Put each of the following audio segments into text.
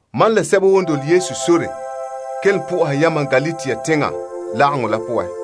Mam la sɛba woo n dole Yesu sore po'ohe yamam Galatia teŋa lagaŋɔ la woo na.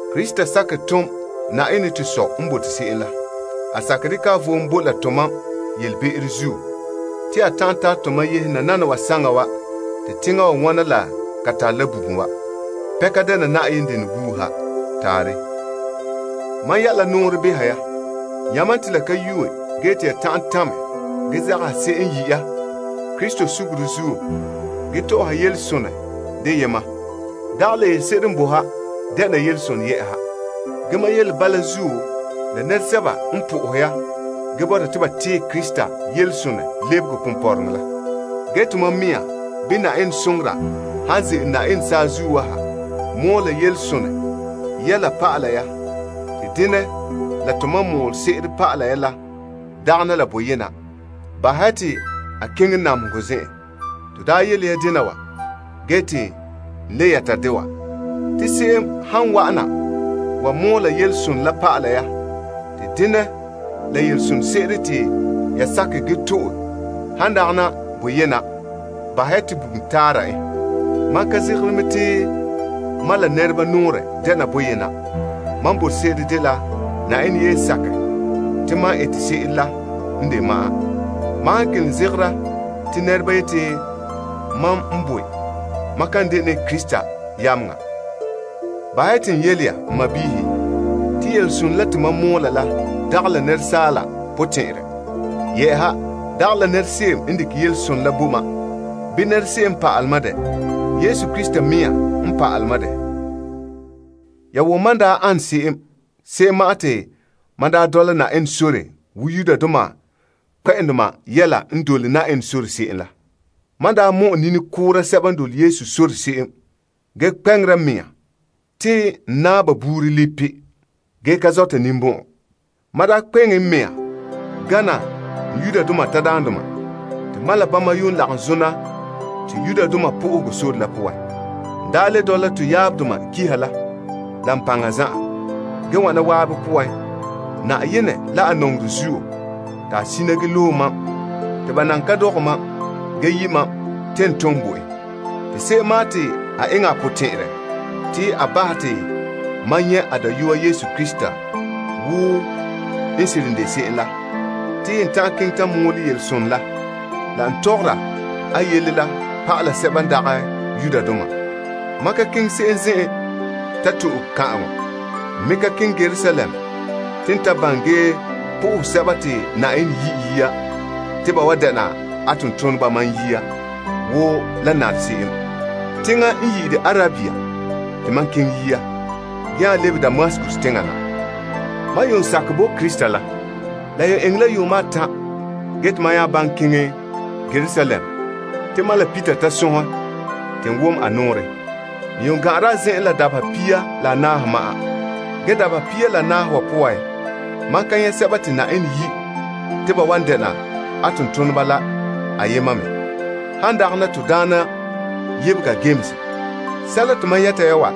Krista sakɛ tom to Yenɛ la to Sɔ n bote se'em la, ki bo to te a fan' to be'em saŋa wa poan bahɛ. Pɛnka dɛna Yenɛ denɛ wuuha! Taarɛ. Mam ya' la nɔɔrɛ beha ya. Yamam te la ka yuue ge te ya ta'an tamɛ ge zagaha se'em n yi' ya doohe Krista zo'ohogɔ la, ge tɔ'ɔha Yelesoma deyema? Dagɛ la yelese'ere n boe ha dɛna Yelesoma yɛ'ɛha, ge mam yele bala zuo la nɛresɛba n pan'ahe ya, bɔta te ba tee Krista Yelesonɛ lebege ponpɔrɔŋɔ la. Ge Tomam mea bii soŋora han ze'ele saazuo ha na mɔɔla Yelesoma yɛla pa'ala ya te dene la tomam n mɔɔle se'ere pa'ale ya la dagɛ na boyena, bahɛ ya te a keŋɛ namehegɔ zen'an. To daa yele ya dena wa, ge te n le yɛta ya wa, te se'em han wa'ana mɔɔla Yelesoma la pa'ala ya te dene la yelesoma se'ere te ya sakɛ ge to'e han dagɛ na boyena, bahɛ ya te a keŋɛ namehegɔ zen'an. Mam ka zegere mɛ te mam la nɛreba nɔɔrɛ dɛna boyena. Mam n bote se'ere dela Yenɛ yen sakɛ te mam n ete se'ere la n de ma'an. Mam han kelom zegera te nɛreba yeti mam n boe, mam kan dene Krista yameŋa. Bahɛ ya te n yele ya, n sɔɔnrɔ, te Yelesonɛ la te mam mɔɔla la dagɛ la asaala potɛn'ɛrɛ. Yɛ'ɛha, dagɛ la se'em n dekɛ Yelesonɛ la bo mam, bii se'em n pa'alɛ mam dɛ. Yesu Krista mɛŋa n pa'ale mam dɛ. Ya wom mam n daa ane se'em, se'em ma'an te mam daa dɔla Yenɛ sore wo Yudoma n dole Yenɛ sore se'em la. Mam n daa mɔ'ɛ nini koora sɛba n dole Yesu sore se'em, ge kpeŋera n mɛŋa te n ba'ahɛ ba ge ka zɔta ninbɔn'ɔn. Mam daa kpeŋe n mɛŋa gana n Yudoma tadaandoma, te mam la bama yuuma lagom zɔna, te Yudoma po'ohegɔ sore la poan. N daa le dɔla to yaabdoma kiha la, la n paŋa zan'an. Ge wana zan'an poan, Yenɛ la a zo'ohogɔ zuo, a loe mam mɛ, te ba nan ka dɔgɛ mam ge yi' mam te n wa'ana tom bo en. Te se'em ma'an te a eŋɛ a potɛn'ɛrɛ, te a bahɛ te mam nyɛ' a Dayɔa Yesu Krista wo n seren de se'em la, te n ta'an keŋɛ ta mɔɔlɛ Yelesoma la n tɔgɔre a yele la pa'alɛ sɛba n dagɛ Yudoma, mam ka keŋɛ se'em zen'en ta to'e kan'aŋɔ. N me ka keŋɛ Yerusalem te n ta baŋɛ ge po'ohe sɛba te Yenɛ yi' yia te ba wa dɛna a tontoneba mam yia, wo la nare se'em. Teŋa n yi'ire Arabia te mam keŋɛ yia, ge nya lebe Damaskus teŋa na. Mam n yuun sakɛ bo Krista la, la yuun eŋɛ la yuuma atan' ge te mam nya baŋɛ keŋɛ Yerusalem te mam la Peter ta sɔnhɛ te n wom a nɔɔrɛn. N yuun gan'anrɛ a zen'en la dabeha pia la anaahe ma'an. Ge dabeha pia la anaahe wa poan mam ka nyɛ sɛba te Yenɛ yi te ba wan dena a tontoneba la ayema me, han dagana to Daana yebega Yames. Sɛla te mam yɛta ya wa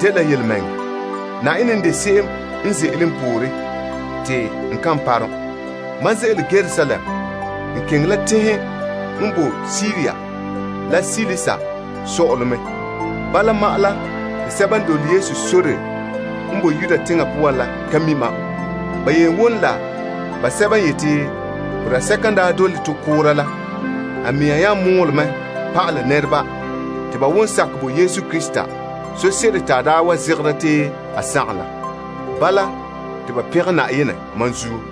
dela yelemɛŋɛrɛ. Yenɛ n de se'em n ze'ele n pooren, n ka parone. Mam ze'ele Yerusalem, n keŋɛ la teŋhe n boe Siria la Silisia sɔ'ɔlomen. Bala ma'an la, te lagaŋɔ seko n boe Yudea teŋa poan la ka mi mam. Ba wom la basɛba n yeti, Boraa sɛka n daa dole to koora la, a mɛŋa nya mɔɔle mɛ pa'ala nɛreba te ba won sakɛ bo Yesu Krista sose'ere te a daa wa zegera te a sagom la. Bala, te ba pɛngɛ Yenɛ mam zuo.